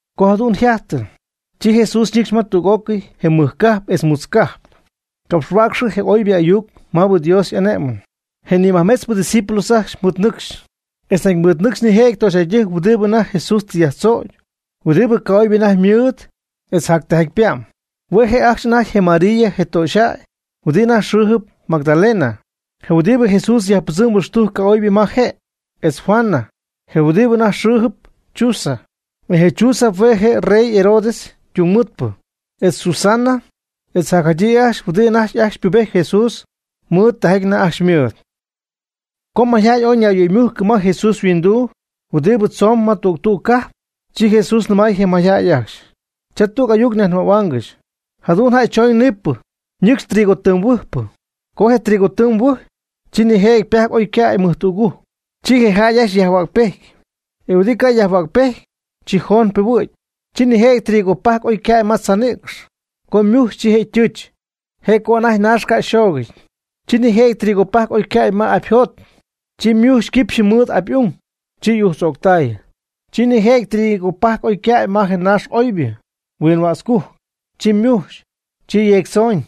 Co jadu'n yjajtɨ, chi Jesús ñɨcxy ma tüg'ócɨy je mɨj cajp etz mutz cajp, capxhuäcxy je oybɨ ayuc maabɨ Dios y'ané'mɨn. Je nimajmetzpɨ ydiscípulos ajcxy mɨɨd ñɨcxy. Etz nañ ymɨɨdnɨcx nijëjɨty töxyjäydɨjc huɨdi anajty Jesús tɨ yajtzögy huɨdi ca'oybɨ anajty ymɨɨd etz jac tijaty pa'm. Hue' je' ajcxy anajty je María je töxyjäy huɨdi anajty xɨ́ɨjɨp Magdalena, je huɨdibɨ Jesús yajpɨdzɨmɨ huɨxtujc ca'oybɨ ma je'; etz Juana, je huɨdibɨ ñäy anajty xɨɨjɨp Chuza, e je Chuza hue' je' je rey Herodes ytungmɨɨdpɨ; etz Susana, etz jacjadyii ajcxy huɨdi anajty ajcxy pubejt Jesús mɨɨd tijaty anajty ajcxy ymɨɨd. Co mayjäy ooy ñayyöymujc ma Jesús yhuinduu huɨdi tzoon ma tüg tüg cajp, chi Jesús nɨmay je mayjäy ajcxy: ―Cha tüg ayuc nyajnɨmähuaangɨxy. Jadu'n jäy tüg choñ niipɨ, ñɨcxy trigo tɨɨm huɨjpɨ. Co je trigo tɨɨm huɨjy, chi nijëjɨty ypajc oy ycäy mɨjtügujc, chi je jäy ajcxy yajhuägpejty, e huɨdi ca' yajhuägpejty, chi joon piihuɨ̈gy. Chi nijëjɨty trigo pajc oycäy ma tzaa nïcx. Co ymujxy chi je' ytɨɨch, je' co anajty naax ca' yxoogɨty. Chi nijëjɨty trigo pajc oycäy ma apyjot, chi ymujxy quipxy mɨɨd apy'ung, chi y'ujtz'o'ctay. Chi nijëjɨty trigo pajc oycäy ma je naax oybɨ huinnätzcujc, chi ymujxy, chi yeectzooñ,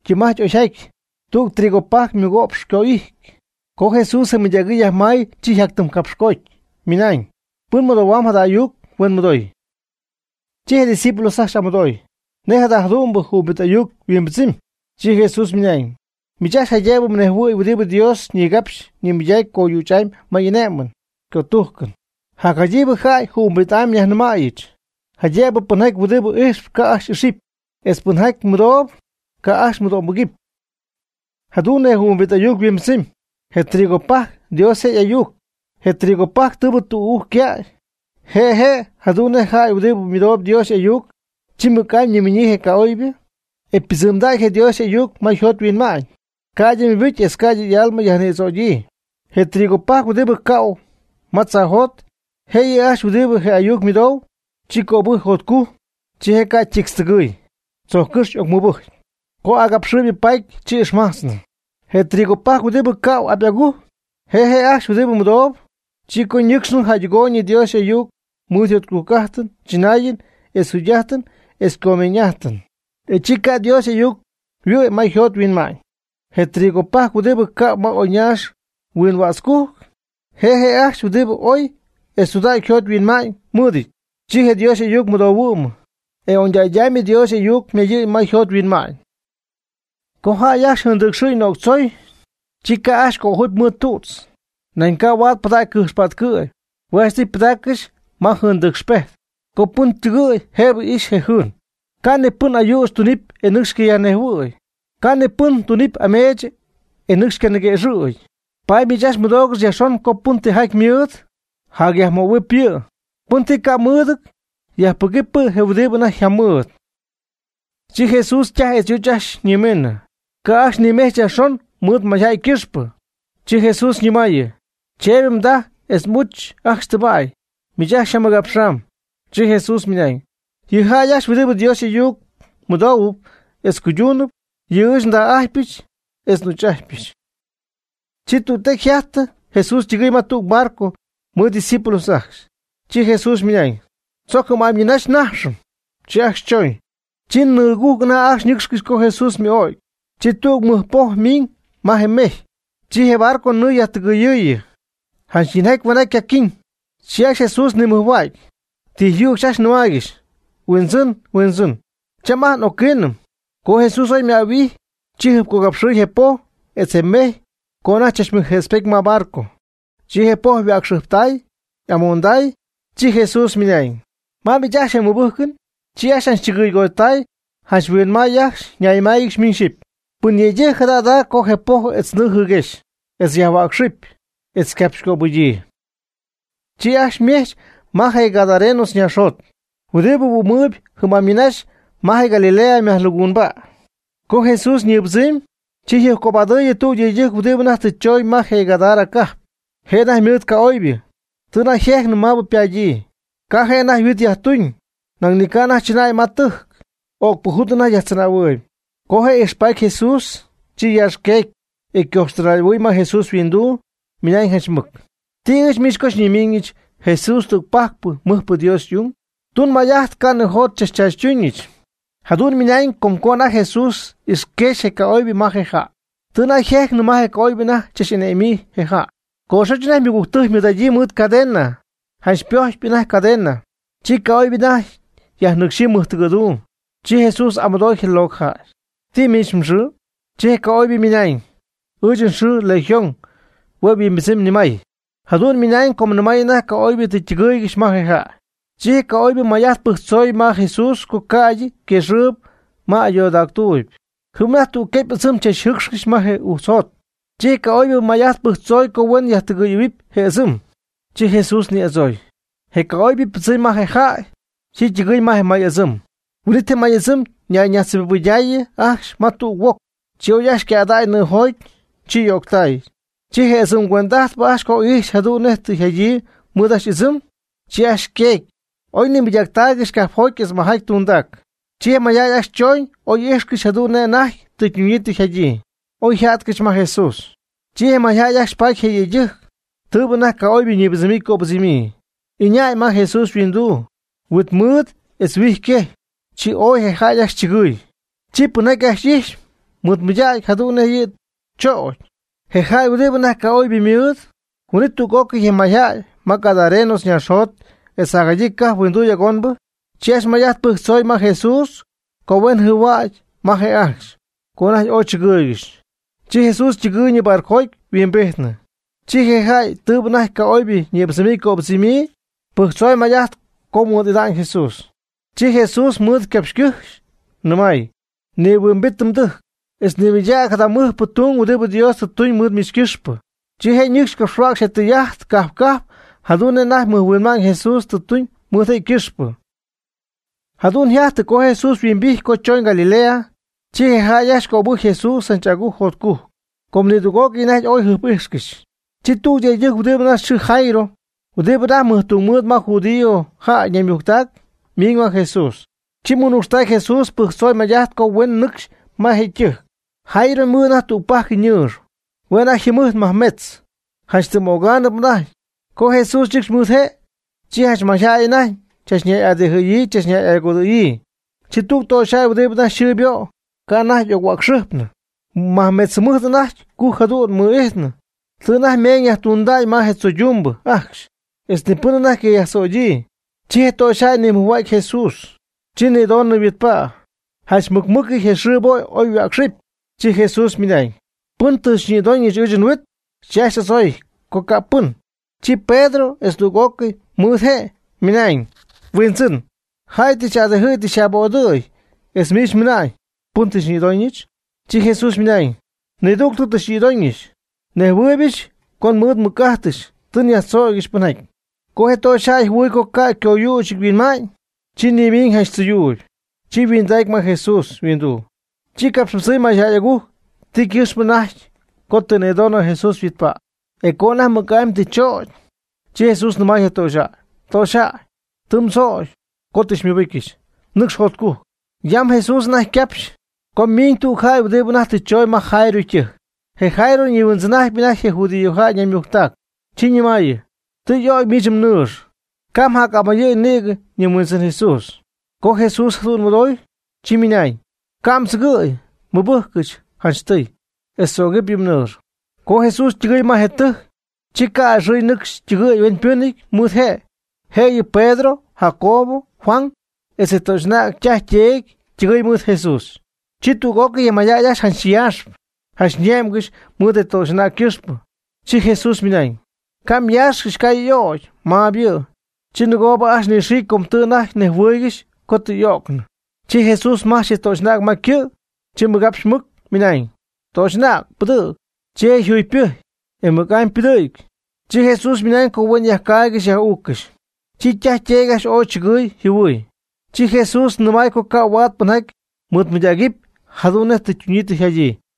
ytɨɨm'ajty oyjaty, tüg trigo pajc mɨgo'px oyco'ity. Co Jesús je mɨydägɨɨ yajmay chi yjactɨmcapxcoty, ymɨnañ: ―Pɨn mɨdohuamb jada ayuc, huen mɨdooy. Chi je discípulos ajcxy y'amɨdooy: ―¿Nej jada jadu'mbɨ jɨhuimbit ayuc yhuimbɨdzɨmy? Chi Jesús ymɨnañ: ―Miich ajcxy jaydëbɨ mnejhuɨ̈huɨpy huɨdi Dios ñigapxpy ñimɨydacpy coyüch'amy ma y'ané'mɨn ycötújcɨn. Jacjadyiibɨ jäy jɨhuimbit'amy nyajnɨmayɨch, jaydëbɨ pɨnjaty huɨdi ijxp ca' ajcxy y'ixɨpy, etz pɨnjaty mɨdoob, ca' ajcxy mɨdo'mbɨgɨpy. Jadu'n je jɨhuimbit ayuc yhuimbɨdzɨmy: Je trigo pajc Dios je' y'ayuc. Je trigo pajc tɨɨbɨ tügujc ycäy, je' je' jadu'n nej jäy huɨdi mɨdoob Dios y'ayuc, chi mɨc'amy ñiminyii je ca'oybɨ, e piibɨdzɨmdäy je Dios y'ayuc ma yjot yhuinma'ñ, ca'ydɨ mɨbɨc etz ca'ydɨ y'alma yajnïdzögyii. Je trigopajc huɨdi cähuɨ ma tzaajot, je' yɨ' ajcxy huɨdi je ayuc mɨdoob, chi cöbɨcy jotcujc, chi je' ca' ytictztɨgɨ̈y, tzojccɨ́xy y'ocmɨbɨcy, co agapxɨɨyb paaty chi ixmajtznɨ. Je trigo pajc huɨdi tɨ cähuɨ apy'agujc, je' je' ajcxy huɨdibɨ mɨdoob, chi co ñɨcxnɨ jäydɨgooyñɨ Dios y'ayuc mɨɨd jotcujc'ájtɨn tzɨnaayɨn etz jugy'ájtɨn etz comeeñ'ájtɨn, e chi ca' Dios y'ayuc yhuɨ'my ma yjot yhuinma'ñ. Je trigo pajc huɨdi cähuɨ ma oyñaax huinnätzcujc, je' ajcxy huɨdi oy etz tudägy yjot yhuinma'ñ mɨɨdɨty. Chi je Dios y'ayuc mɨdohuɨ'my, e oñdägy'amy Dios y'ayuc ymayɨ̈y ma yjot yhuinma'ñ. Co jäy ajcxy jɨɨndɨcxɨ'ñ nöctzoy, chi ca' ajcxy cöjupy mɨɨd tu'tz, nañ ca' huaad pɨdägy cɨjx pätcɨ'py, hue' janchtɨy pɨdaaccɨxy ma jɨɨndɨcxpejt, co pɨn ytɨgɨ̈y jëbɨ ixy je jɨɨn. Ca' ni pɨn ayüch tunɨpy e nɨcxy ycayajnejhuɨ̈y, ca' ni pɨn ti tunɨpy ameech e nɨcxy ycaniquëxɨ̈gy. Paady miich ajcxy mɨdoogɨx yajxon co pɨn tijaty mɨɨd, jacyajmöhuɨp yɨ'. Pɨn ti camɨɨd, yajpɨgɨpy je' huɨdi anajty yjamɨɨd. Chi Jesús ytaj etz y'uch ajcxy ñimiinɨ, ca' ajcxy nimejch Jesús yajxon mɨɨd mayjäy ycɨxpɨ. Chi Jesús yñɨmaayɨ: ―Cheeby mdaj etz m'uch ajcxy tɨba'y, miich ajcxy xyjamɨgapxam. Chi Jesús ymɨnañ: ―Yɨ jäy ajcxy huɨdibɨ Dios ayuc mɨdoohuɨpy etz cuyduunɨp, yɨ' ɨɨch ndaj'ájtypɨch etz n'uch'ájtypɨch. Chi tüg tecy yjajtɨ Jesús ytɨgɨɨy ma tüg barco mɨɨd ydiscípulos ajcxy, chi Jesús ymɨnañ: ―Tzoc jɨm'amy ñɨɨnaxy nájxɨm. Chi ajcxy chooñ. Chi nɨɨgujc anajty nɨ́cxcɨxy co Jesús ymɨ'ögy. Chi tüg mɨc poj miñ ma je mejy. Chi je barco ñɨɨ yajtɨgɨyɨɨyɨ, janch yinjaty jahueenjaty ycaquiiñ. Chi ajcxy Jesús nimɨjhuägy, tijyücxy ajcxy nɨmaaygɨxy: ―¡Huindzɨn! ¡Huindzɨn! Cham ajt n'ocquiinɨm. Co Jesús oy ymäyhuijy, chi jɨjpcogapxɨɨy je poj etz je mejy co anajty chachmɨjjëtzpety ma barco. Chi je poj yhuäcxɨjptay, y'amoonday. Chi Jesús ymɨnañ: ―¿Ma miich ajcxy je mmɨbɨ́jcɨn? Chi ajcxy yjanchchɨgɨygoty janch yhuinmay ajcxy ñayñɨmáayɨgɨxy miñ xyɨpy: ―Pɨn yëydɨjc jada jada' co je poj etz nɨɨ jɨɨguexy, etz yajhuäcxɨpy, etz ycapxycöbɨgyii. Chi ajcxy ymejch ma je gadarenos naaxjot, huɨdi huɨ'm jɨm'amy ñɨɨnaxy ma je Galilea mɨjlaguunba'. Co Jesús ñɨɨbɨdzɨmy, chi jɨjpcobadɨy tüg yëydɨjc huɨdi anajty tɨ choñ ma je Gadara cajp. Je' anajty ymɨɨd ca'oybɨ, tɨ anajty yjejcnɨ maabɨ ypadyii. Ca' je' anajty huit yajtuñ, nañ ni ca' anajty chɨnäy ma ytɨjc, öcpɨjut anajty yajtzɨnähuɨɨyb. Co je' ixpaty Jesús, chi yaaxqueecy, e ycoxtɨnay'ahuɨɨy ma Jesús yhuinduu, ymɨnañ janch mɨc: ―¿Ti ɨɨch miich co xyñimiiñɨch, Jesús, tügpajc mɨjpɨ Dios y'ung? Tun may'ajt ca' nijot xychachchaachytúñɨch. Jadu'n mɨnañ com co anajty Jesús ixquexy je ca'oybɨ ma je jäy, tɨ anajty yjejcnɨ ma je ca'oybɨ anajty tzach'ane'my je jäy. Coxoch anajty ymɨgügtɨjc ymɨɨd'adyii mɨɨd cadena. Janch ypojtpy cadena, chi ca'oybɨ anajty yajnɨcxyii mɨjtɨgɨ̈duum. Chi Jesús y'amɨdooy je locɨjäy: ―¿Ti miich mxɨɨ? Chi je ca'oybɨ ymɨnañ: ―Ɨɨch nxɨɨ Legión (hue' yhuimbɨdzɨmy nimay). Jadu'n mɨnañ com nimay anajty ca'oybɨ tɨ ytɨgɨɨygɨxy ma je jäy. Chi je ca'oybɨ may'ajt pɨjctzoy ma Jesús co ca'ydɨ yquexyii ma ayoodactuuby. Jɨm anajty tüg quepy ɨdzɨm chachjɨɨcxcɨxy ma je ujtzjot. Chi je ca'oybɨ may'ajt pɨjctzoy co huen yajtɨgɨyɨ̈huɨpy je' ɨdzɨm. Chi Jesús ni'adzooy. Co je ca'oybɨ ypɨdzɨmy ma je jäy, chi ytɨgɨɨy ma je may'ɨdzɨm. Huin'it je may'ɨdzɨm ñayñajtzjɨbibɨydaayɨ ajcxy ma tüg ahuoc, chi oy ajcxy ycädäy nɨɨjoty, chi y'ögtay. Chi je ɨdzɨm cuend'ajtpɨ ajcxy co ixy jadu'n nej tɨ yjadyii mɨɨd ajcxy y'ɨdzɨm, chi ajcxy yqueecy, oy nimɨydaaccɨxy cajpjoty etz majaty tundac. Chi mayjäy ajcxy chooñ oy íjxcɨxy jadu'n nej anajty tɨ ytunyii tɨ jadyii, oyja'tcɨxy ma Jesús. Chi je mayjäy ajcxy paty je yëydɨjc, tɨɨbɨ anajty ca'oybɨ ñïbɨdzɨmyii ycöbɨdzɨmyii, ɨñäy ma Jesús yhuinduu, huit mɨɨd etz huijy quejy, chi ooy je jäy ajcxy chɨgɨɨy. Chi pɨnjaty ajcxy ijx mɨɨd mɨydacy jadu'n nej yɨ' choocy, je jäy huɨdi anajty ca'oybɨ mɨɨd. Huin'it tüg'ócɨy je mayjäy ma gadarenos naaxjot etz jadyii cajp huinduy agonbɨ, chi ajcxy may'ajt pɨjctzoy ma Jesús co huen jɨhuägy ma je' ajcxy, co anajty ooy chɨgɨɨygɨxy. Chi Jesús ytɨgɨɨyñɨ barcojoty yhuimbijtnɨ. Chi je jäy tɨɨbɨ anajty ca'oybɨ ñïbɨdzɨmyii ycöbɨdzɨmyii pɨjctzoy may'ajt co mɨɨd'idan Jesús. Chi Jesús mɨɨd capxycɨ́jxy, nɨmay: ―Nihuimbit mdɨjc, etz nimɨydäg jada mɨjpɨ tung huɨdibɨ Dios tɨ tuñ mɨɨd miich ycɨxpɨ. Chi je' ñɨcxy capxhuäcxy je tɨy'ajt cajp cajp jadu'n nej anajty mɨjhuinma'ñ Jesús tɨ tuñ mɨɨd je' ycɨxpɨ. Jadu'n yjajtɨ co Jesús yhuimbijty co chooñ Galilea, chi je jäy ajcxy cöbɨjcy Jesús janch agujc jotcujc, com nidüg'ócɨy anajty ooy jɨjp'íjxcɨxy. Chi tüg yëydɨjc huɨdi anajty yxɨɨ Jairo huɨdibɨ anajty mɨjtungmɨɨd ma judíojäy ñaymujctac ymiiñ ma Jesús, chi mɨnucxtacy Jesús pɨjctzoy may'ajt co huen nɨcxy ma je' ytɨjc. Jairo ymɨɨd anajty tügpajc ñɨɨx, hue' anajty yjɨmɨjt majmetz, janch tɨm ögaanɨp anajty. Co Jesús ñɨcxy mɨɨd je', chi janch mayjäy anajty chach'adijɨ̈yii chach'agodɨ̈yii. Chi tüg töxyjäy huɨdi anajty yxɨɨ ybo', ca' anajty y'oc-huäcxɨjpnɨ, mɨmajmetz jɨmɨjt anajty cujc jadu'n mɨ'ijtnɨ. Tɨ anajty ymeeñ yajtundäy ma je tzoydumbɨ ajcxy, etz ni pɨn anajty ycayajtzögyii. Chi je töxyjäy nimɨjhuägy je Jesús, chi nïdonɨ yhuitpä. Janch mɨc mɨc je yxɨɨ ybo' oy yhuäcxɨpy. Chi Jesús ymɨnañ: ―¿Pɨn xyñïdoñ ɨɨch nhuit? Chi ajcxy y'adzooy co ca' pɨn. Chi Pedro etz tüg'ócɨy mɨɨd je' ymɨnañ: ―Huindzɨn, jäy tɨ xy'adijɨ̈y tɨ xy'abodɨ̈y etz miich mɨna'ñ: “¿Pɨn tɨ xyñïdoñɨch?” Chi Jesús ymɨnañ: ―Nidügtɨ tɨ xyñïdoñɨch. Nnejhuɨ́ɨybɨch co mɨɨd nmɨc'ájtɨch tɨ nyajtzögyɨch pɨnjaty. Co je töxyjäy jɨhuɨɨy co ca' coyüch yhuɨ'ma'ñ, chi nimiiñ janch tzɨyuuyb. Chi yhuindacy ma Jesús yhuinduu, chi capxpɨdzɨmy mayjäy'agujc ti ycɨxpɨ anajty co tɨ nïdoonɨ Jesús yhuitpa', e co anajty mɨc'amy tɨ chögy. Chi Jesús nɨmay je töxyjäy: ―Töxyjäy, tɨ mdzögy co tɨ xymɨbɨcyɨch, nɨcx jotcujc. Yam Jesús anajty ycapxpy, co ymiiñ tüg jäy huɨdi anajty tɨ chooñ ma Jairo ytɨjc; je Jairo nihuindzɨn'ajtp anajty je judiojäy naymujctac, chi nɨmaayɨ: ―Tɨ y'ögy miich mnɨɨx, ca' mjac'amayɨ̈y nïgɨ yɨ Huindzɨn Jesús. Co Jesús jadu'n mɨdooy, chi ymɨnañ: ―Ca' mdzɨgɨ̈y, mɨbɨjcɨch janchtɨy, etz tzögɨp yɨ mnɨɨx. Co Jesús ytɨgɨɨy ma je tɨjc, chi ca' a'ɨxɨɨy nɨcxy ytɨgɨ̈y hueñypɨ́nɨty mɨɨd je'. Jëyɨ Pedro, Jacobo, Juan etz je töxy'anäg ytaj yteedy ytɨgɨɨy mɨɨd Jesús. Chi tüg'ócɨy je mayjäy ajcxy janch yaaxp, janch ñé'mgɨxy mɨɨd je töxy'anäg ycɨxpɨ. Chi Jesús ymɨnañ: ―Ca' myaaxcɨxy, ca' yɨ' ögɨty, maab yɨ'. Chi nɨgoob ajcxy nɨxiicy com tɨ anajty nejhuɨɨygɨxy co tɨ y'ögnɨ. Chi Jesús majch je töxy'anäg ma ycɨ', chi mɨgapxy mɨc, ymɨnañ: ―Töxy'anäg pɨdɨ̈g. Chi je' yjugypɨjcy, e mɨc'amy ypɨdɨ̈gy. Chi Jesús ymɨnañ co huen yajcaaygɨxy yaj'uuccɨxy. Chi ytaj yteedy ajcxy ooy chɨgɨɨy yjɨhuɨɨy. Chi Jesús nɨmay co ca' huaad pɨnjaty mɨɨdmɨydägɨpy jadu'n nej tɨ ytuñyii yjadyii.